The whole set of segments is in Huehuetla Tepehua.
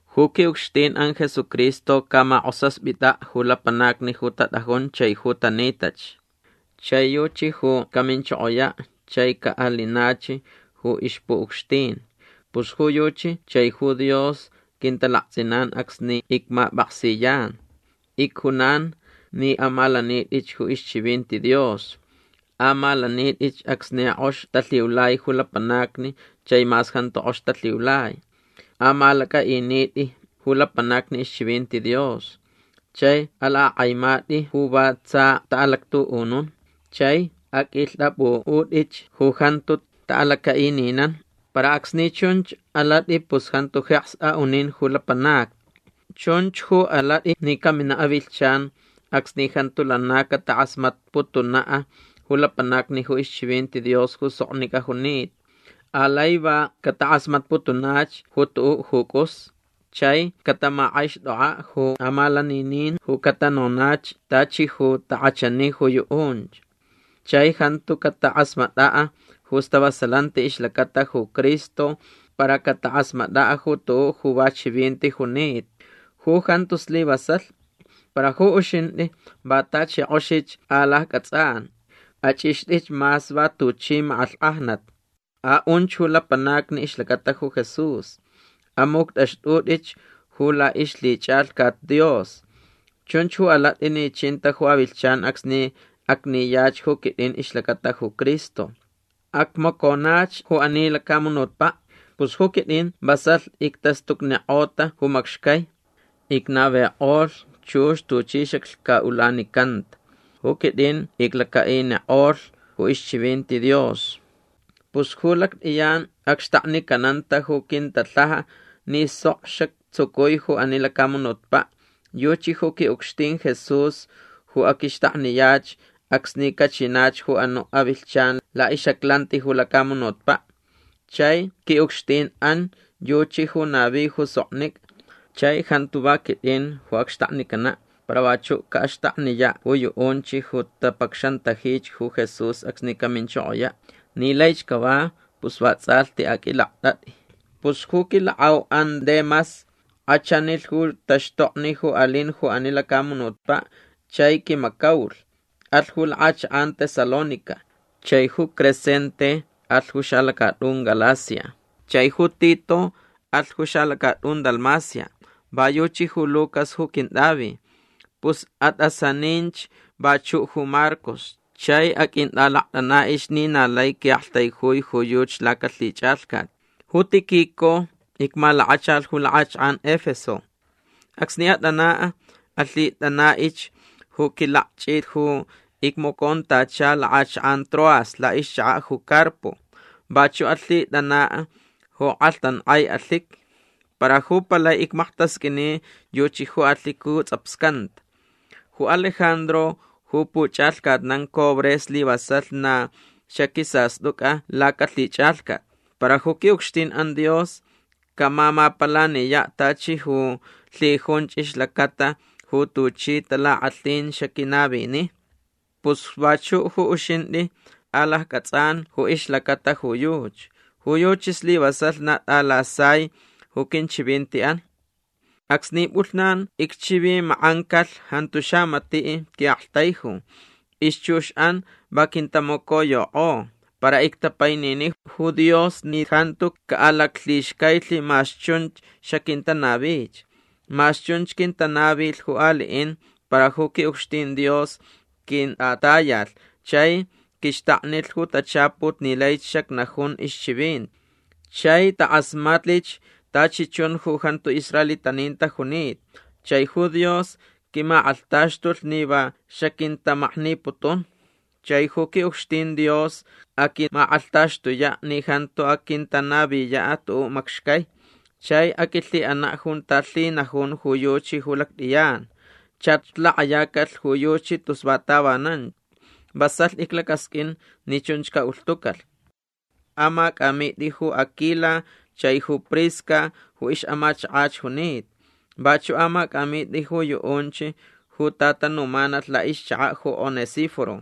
Ju qui'ucxtin'an Jesucristo camak'osaspita' ju lapanacni ju tat'ajun chai ju tanitach. Chai yuchi ju caminchokoya' chai ca'alinach ju ixpu'ucxtin. Pus ju yuchi chai ju Dios quintalakts'inan acsni icmap'aksiyan. Icjunan ni amalanit'ich ju ixchivinti Dios. Amalanit'ich acsni k'ox talhiulai ju lapanacni chai mas jantu k'ox talhiulai. Amalac'a'init'i ju lapanacni ixchivinti Dios. Chai alak'ak'aimat'i ju va tsa ta'alactu'unun. Chai aq'uilht'ap'u'ut'ich ju jantu ta'alaca'ininan. Para acsni chunch alat'i pus jantu jeks a'unin ju lapanacni. Chunch ju alat'i ni camina' avilhchan acsni jantu lana catak'asmatputuna' ju lapanacni ju ixchivinti Dios ju soknic'a junita. Alai va catak'asmatputunach ju tu'u' ju c'us. Chai catamak'aixt'ok'a' ju amalaninin ju catanonach tachi ju tak'achani ju yu'unch. Chai jantu catak'asmat'a' ju stavasalanti ixlacata ju Cristo para catak'asmat'a' ju tu'u' ju va chivinti junita. Ju jantu slivasalh. Para ju uxint'i va tachi k'oxich alacc'ats'an. Ach'ixt'ich mas va tuchi mak'alhk'ajnat. A'unch ju lapanacni ixlacata ju Jesús. Amuct'axt'ut'ich ju la'ixlhich'alhcat Dios. Chunch ju alat'i ni chinta ju avilhchan acsni acniyach ju quit'in ixlacata ju Cristo. Acmaconach ju ani lacamunutpa'. Pus ju quit'in vasalh ictastucnik'ota ju macxcai. Icnavik'olh chux tuchi xaclhca'ulanicanta. Ju quit'in iclaca'inik'olhch ju ixchivinti Dios. Pus ju lact'iyan acxtaknicananta ju quintalhaja ni sok xactsucui ju ani lacamunutpa'. Yuchi ju qui'ucxtin Jesús ju aquixtakniyach acsni cachinach ju anu' avilhchan la'ix'aclanti ju lacamunutpa'. Chai qui'ucxtin'an yuchi ju navi ju soknic'a. Chai jantu va quit'in ju acxtaknicana' para vachu' ca'axtakniya' ju yu'unch ju tapacxantajich ju Jesús acsni caminchokoya'. Ni laich cava pus vats'alhti aq'uilakt'at'i. Pus ju quilak'au'an Demas k'achanilh ju taxtokni ju alin ju ani lacamunutpa' chai quimacaulh. Alh ju lak'achak'an Tesalónica. Chai ju Crescente alh ju xalacat'un Galacia. Chai ju Tito alh ju xalacat'un Dalmacia. Va yuchi ju Lucas ju quint'avi. Pus at'asaninch vachu' ju Marcos chai aq'uint'alakt'ana'ich ni na lai qui'aktaijui ju yuchi lacalhich'alhcat. Ju Tíquico icmalakachalh ju lak'achak'an Efeso. Acsni at'ana' alhit'ana'ich ju quilakch'it ju icmacontacha lak'achak'an Troas la'ixchaka' ju Carpo. Vachu' alhit'ana' ju k'alhtank'ai alhiqui. Para ju palai icmaktasq'uini yuchi ju alhiqui ju ts'apscanta. Ju Alejandro ju puch'alhcatnan cobre slivasalh na xaquisast'uc'a lacalhich'alhcat. Para ju qui'ucxtin'an Dios camamapalaniya' tachi ju lhijunch ixlacata ju tuchi talak'alhin xaquinavini. Pus vachu' ju uxint'i alacc'ats'an ju ixlacata ju yuchi. Ju yuchi slivasalh na t'alasai ju quinchivinti'an. Acsni p'ulhnan icchivimak'ancalh jantu xamati' qui'aktaiju. Ixchux'an va quintamacoyok'o. Para ictapainini ju Dios ni jantu ca'alaclhixcailh mas chunch xaquintanavich. Mas chunch quintanavilh ju ali'in para ju qui'ucxtin Dios quint'atayalh chai quixtaknilh ju tachaput ni laich xacnajun ixchivinti. Chai tak'asmatlich tachi chun ju jantu israelitanin tajunita. Chai ju Dios quimak'alhtaxtulh ni va xaquintamakniputun. Chai ju qui'ucxtin Dios aquimak'alhtaxtuya' ni jantu aquintanaviya' tu'u' macxcai. Chai aquilhi'ana' junta lhinajun ju yuchi ju lact'iyan. Chach lak'ayacalh ju yuchi tus va tavanan. Vasalh iclacasq'uin ni chunch ca'ulhtucalh. Amac'amit'i ju Aquila chai ju Prisca ju ix'amachakach junita. Vachu' amac'amit'i ju yu'unch ju tatanumanalh la'ixchaka' ju Onesíforo.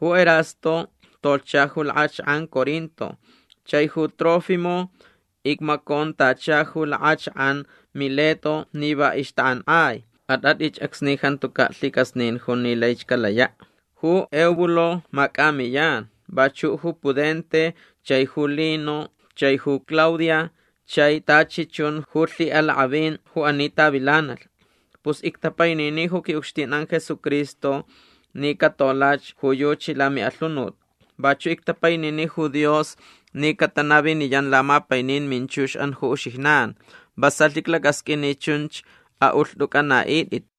Ju Erasto tolhcha ju lak'achak'an Corinto. Chai ju Trófimo icmacontacha ju lak'achak'an Mileto ni va ixtak'ank'ai. At'at'ich acsni jantuca' lhic'asnin jun ni laich calaya'. Ju Eubulo mac'amiyan. Vachu' ju Pudente chai ju Lino chai ju Claudia chai tachi chun ju lhi'alak'avin ju ani tavilanalh. Pus ictapainini ju qui'ucxtin'an Jesucristo ni catolach ju yuchi lami'alhunut. Vachu' ictapainini ju Dios ni catanaviniyan lamapainin minchux'an ju uxijnan. Vasalh iclacasq'uin ni chunch a'ulht'uc'ana'it'it.